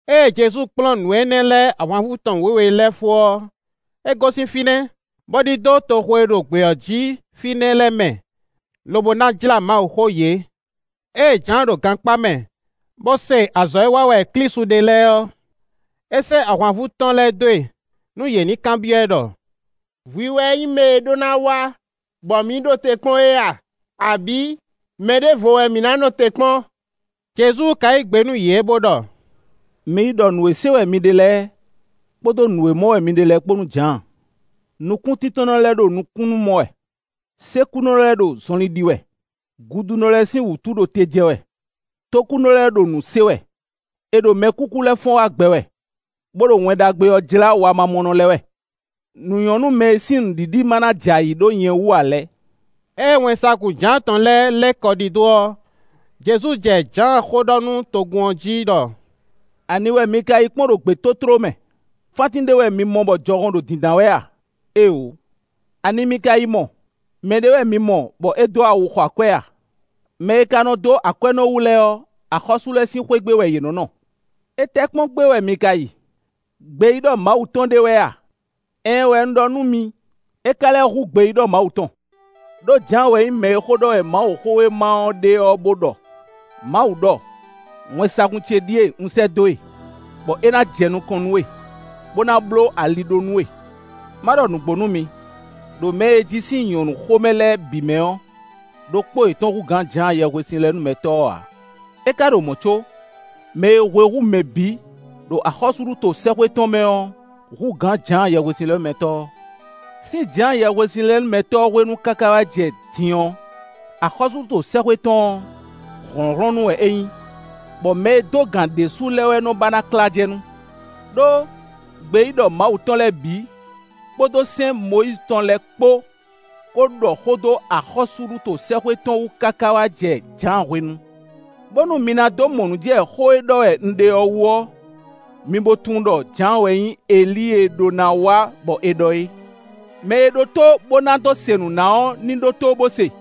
Ée Jezu kplɔ́n nǔ énɛ́ lɛ́ɛ ahwanvú tɔn wěwe lɛ́ɛ fó ɔ́, é gosín fínɛ́, bó ɖidó toxo e ɖo gbě ɔ́ jí fínɛ́ lɛ́ɛ mɛ, lobo ná jlá Mawuxó yě. Ée Jǎan ɖo gankpá mɛ, bó se azɔ̌ e wa wɛ Klísu ɖe lɛ́ɛ ɔ́, é sɛ́ ahwanvú tɔn lɛ́ɛ dó e, nú yě ní yi kanbyɔ́ ɛ ɖɔ: “Hwi wɛ nyí mɛ e ɖó ná wá, bɔ mǐ ɖo te kpɔ́n é a? Abǐ mɛ ɖěvo wɛ mǐ ná nɔ te kpɔ́n?” Jezu ka yí gbe nú yě bó ɖɔ: “Mi yi ɖɔ nǔ e se wɛ mi ɖe lɛ́ɛ kpódó nǔ e mɔ wɛ mi ɖe lɛ́ɛ kpó nú Jǎan. Nukúntíntɔ́nnɔ lɛ́ɛ ɖo nukúnnú mɔ wɛ; sékúnɔ lɛ́ɛ ɖo zɔnlin ɖi wɛ; gudunɔ lɛ́ɛ sín wǔtu ɖo te jɛ wɛ; tókúnɔ lɛ́ɛ ɖo nǔ se wɛ; è ɖo mɛkúkú lɛ́ɛ fɔ́n wá gbɛ wɛ, bó ɖo Wɛn Ɖagbe ɔ́ jlá wamamɔnɔ lɛ́ɛ wɛ. Nǔ nyɔ́ nú mɛ e sín nǔɖiɖi ma ná jɛ ayǐ ɖó nyɛ wú ǎ lɛ́ɛ.” Ée wɛnsagun Jǎan tɔn lɛ́ɛ lɛ́ kɔ ɖidó ɔ́, Jezu jɛ Jǎan xó ɖɔ nú togun ɔ́ jí ɖɔ: “Ani wɛ mi ka yi kpɔ́n ɖo gbětótló mɛ? Fántín ɖé wɛ mi mɔ bɔ jɔhɔn ɖo dǐndán wɛ a? Éeǒ! Ani mi ka yi mɔ? Mɛ ɖé wɛ mi mɔ, bɔ é dó awu xɔ akwɛ́ a? Mɛ e ka nɔ dó akwɛ́nɔwu lɛ́ɛ ɔ́, axɔ́sú lɛ́ɛ sín xwé gbe wɛ yě nɔ́ nɔ. Étɛ́ kpɔ́n gbé wɛ mi ka yi? Gbeyíɖɔ Mawu tɔn ɖé wɛ a? Ɛɛn wɛ un ɖɔ nú mi; é ka lɛ́ hú gbeyíɖɔ Mawu tɔn. Ɖó Jǎan wɛ nyí mɛ e xó ɖɔ wɛ Mawuxówéma ɔ́ ɖe ɔ́ bó ɖɔ: Mawu ɖɔ: ‘Wɛnsagun ce ɖíe un sɛ́ dó e, bɔ é ná jɛ nukɔn nú we, bó ná bló ali ɖó nú we.’ Má ɖɔ nǔgbó nú mi: ɖo mɛ e è ji sín nyɔ̌nu xomɛ lɛ́ɛ bǐ mɛ ɔ́, ɖokpó yětɔn hú gǎn Jǎan Yɛhwesinlɛnúmɛtɔ́ ɔ́ ǎ. É ka ɖo mɔ̌ có, mɛ e hwe hú mɛ bǐ, ɖo axɔ́súɖuto sɛ́xwé tɔn mɛ ɔ́, hú gǎn Jǎan Yɛhwesinlɛnúmɛtɔ́ ɔ́. Sín Jǎan Yɛhwesinlɛnúmɛtɔ́ ɔ́ hwenu káká wá jɛ din ɔ́, axɔ́súɖuto sɛ́xwé tɔn ɔ́, hlɔ̌nhlɔ́n nú wɛ é nyí, bɔ mɛ e dó gǎn ɖésú lɛ́ɛ wɛ nɔ́ ba ná klá jɛ nu. Ɖó gbeyíɖɔ Mawu tɔn lɛ́ɛ bǐ kpódó sɛ́n Mɔyízi tɔn lɛ́ɛ kpó ko ɖɔ xó dó axɔ́súɖuto sɛ́xwé tɔn wú káká wá jɛ Jǎan hwenu. Bónú mi ná dó mɔ nǔ jɛ xó e ɖɔ wɛ un ɖe ɔ́ wú ɔ́, mi bo tunwun ɖɔ Jǎan wɛ nyí Elíi e ɖó ná wá bɔ è ɖɔ é. Mɛ e ɖó tó, bó ná dó se nǔ ná ɔ́ ní ɖótó, bó se.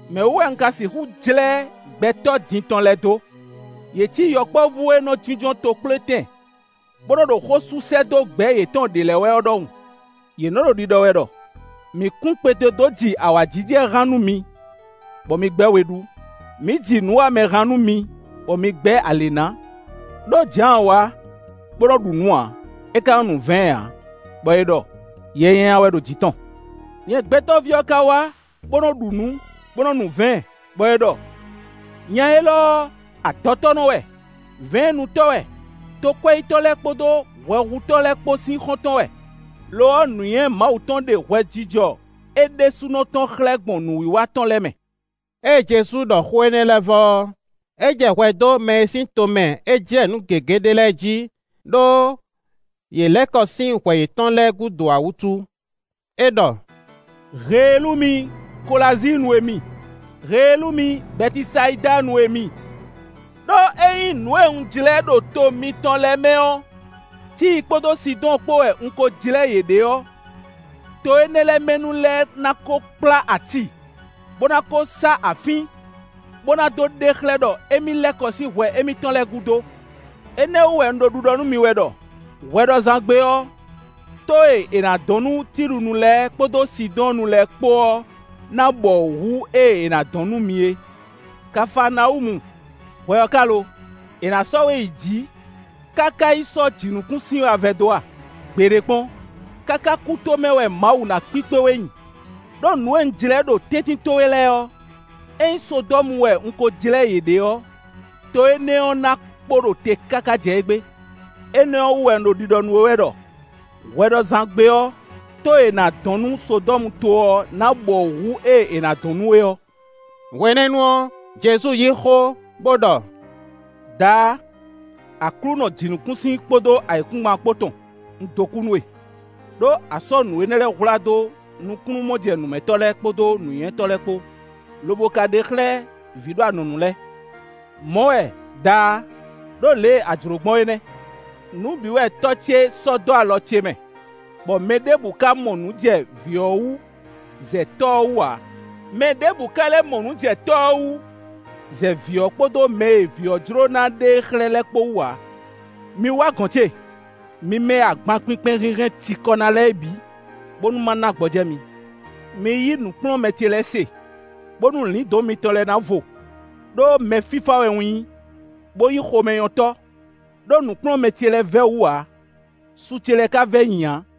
“Mɛ̌ wú wɛ un ka sigǎn jlɛ́ gbɛtɔ́ din tɔn lɛ́ɛ dó? Yě cí yɔkpɔ́vú e nɔ jínjɔ́n tokplétɛn bó nɔ́ ɖo xó sú sɛ́ dó gbɛ̌ yětɔn ɖě lɛ́ɛ wɛ ɔ́ ɖɔhun. Yě nɔ́ ɖo ɖiɖɔ wɛ ɖɔ: ‘Mǐ kún kpete dó ji awǎjijɛ han nú mi, bɔ mi gbɛ́ we ɖú; mǐ ji nǔwamɛ han nú mi bɔ mi gbɛ́ alě ná.’ Ɖó Jǎan wá, bó nɔ́ ɖu nǔ ǎ; é ka nɔ́ nu vɛ̌ɛn ǎ; bɔ è ɖɔ: ‘Yɛ nyanya wɛ ɖo jǐ tɔn.’ Nyɛ Gbɛtɔ́ví ɔ́ ka wá bó nɔ́ ɖu nǔ, bó nɔ́ nu vɛ̌ɛn, bɔ è ɖɔ: ‘Nya élɔ́ ɔ́, adɔtɔ́nɔ wɛ; vɛ̌ɛnnutɔ́ wɛ; tokwɛ́yítɔ́ lɛ́ɛ kpódó hwɛhutɔ́ lɛ́ɛ kpó sín xɔ́ntɔn wɛ.’ Lo ɔ́, nǔnywɛ́ Mawu tɔn ɖe hwɛjijɔ é ɖésúnɔ tɔn xlɛ́ gbɔn nǔwiwa tɔn lɛ́ɛ mɛ.” Ée Jezu ɖɔ xó énɛ́ lɛ́ɛ vɔ ɔ́, é jɛ hwɛ dó mɛ e sín tomɛ é jlɛ́ nǔ gěgé ɖe lɛ́ɛ jí, ɖó yě lɛ́ kɔ sín hwɛ yětɔn lɛ́ɛ gúdo ǎ wútu. É ɖɔ: “Heelú mi, Kolazíinnu e mi! Heelú mi, Bɛtisayidanu e mi! Ɖó ényí nǔ e un jlɛ́ ɖo to mitɔn lɛ́ɛ mɛ ɔ́, Tíi kpódó Sidɔ́ɔn kpó wɛ un ko jlɛ́ yě ɖe ɔ́, to énɛ́ lɛ́ɛ mɛ nu lɛ́ɛ ná ko kplá ati, bó ná ko sá afín, bó ná dó ɖe xlɛ́ ɖɔ émí lɛ́ kɔ sín hwɛ émítɔn lɛ́ɛ gúdo. Énɛ́ ɔ́ wú wɛ un ɖo ɖiɖɔ nú mi wɛ ɖɔ: hwɛɖɔzán gbe ɔ́, tó e è nǎ dɔn nú Tilunu lɛ́ɛ kpódó Sidɔ́ɔnnu lɛ́ɛ kpó ɔ́ ná bɔwǔ hú ée è nǎ dɔn nú mi e. Kafaanawúmu, hwɛ ɔ́ ka lo? È nǎ sɔ́ we yi jǐ káká yi sɔ́ jǐnukúnsin wɛ a vɛdó a? Gbeɖé kpɔ́n! Káká kútomɛ wɛ Mawu ná kpíkpé we nyi; ɖó nǔ e un jlɛ́ ɖo tɛ́ntin towe lɛ́ɛ ɔ́, ényí Sodɔ́mu wɛ un ko jlɛ́ yě ɖe ɔ́, to énɛ́ ɔ́ ná kpo ɖo te káká jɛ égbé. Énɛ́ ɔ́ wú wɛ un ɖo ɖiɖɔ nú we wɛ ɖɔ: hwɛɖɔzán gbe ɔ́, tó e è nǎ dɔn nú Sodɔ́muto ɔ́ ná bɔwǔ hú ée è nǎ dɔn nú we ɔ́.” Hwenɛ́nu ɔ́, Jezu yí xó, bó ɖɔ: “Daá! Aklúnɔ jǐnukúnsin kpódó ayǐkúngban kpó tɔn, un dó kú nú we, ɖó a sɔ́ nǔ énɛ́ lɛ́ɛ hwlá dó nukúnnú-mɔjɛnǔmɛtɔ́ lɛ́ɛ kpódó nǔnywɛ́tɔ́ lɛ́ɛ kpó, lobo ka ɖe yě xlɛ́ vǐ ɖo anɔ̌nu lɛ́ɛ. Mɔ̌ wɛ, Daá! Ɖó lě e a jlǒ gbɔn é nɛ́. “Nǔ bǐ wɛ Tɔ́ ce sɔ́ dó alɔ ce mɛ, bɔ mɛ ɖěbǔ ka mɔ nǔ jɛ Vǐ ɔ́ wú, zɛ Tɔ́ ɔ́ wú ǎ; mɛ ɖěbǔ ka lɛ́ mɔ nǔ jɛ Tɔ́ ɔ́ wú, zɛ Vǐ ɔ́ kpódó mɛ e Vǐ ɔ́ jló ná ɖe e xlɛ́ lɛ́ɛ kpó wú ǎ. “Mi wá gɔ̌n ce; mi mɛ e agban kpinkpɛn hinhɛn cikɔ ná lɛ́ɛ é bǐ, bónú ma ná gbɔjɛ́ mi.” Mi yí nǔkplɔ́nmɛ ce lɛ́ɛ se, bónú lǐndɔ̌n mitɔn lɛ́ɛ ná vo, ɖó mɛ fífá wɛ un nyí, bó nyí xomɛnyɔ́tɔ́. Ɖó nǔkplɔ́nmɛ ce lɛ́ɛ vɛ́ wǔ ǎ, su ce lɛ́ɛ ka vɛ́ nyi ǎ.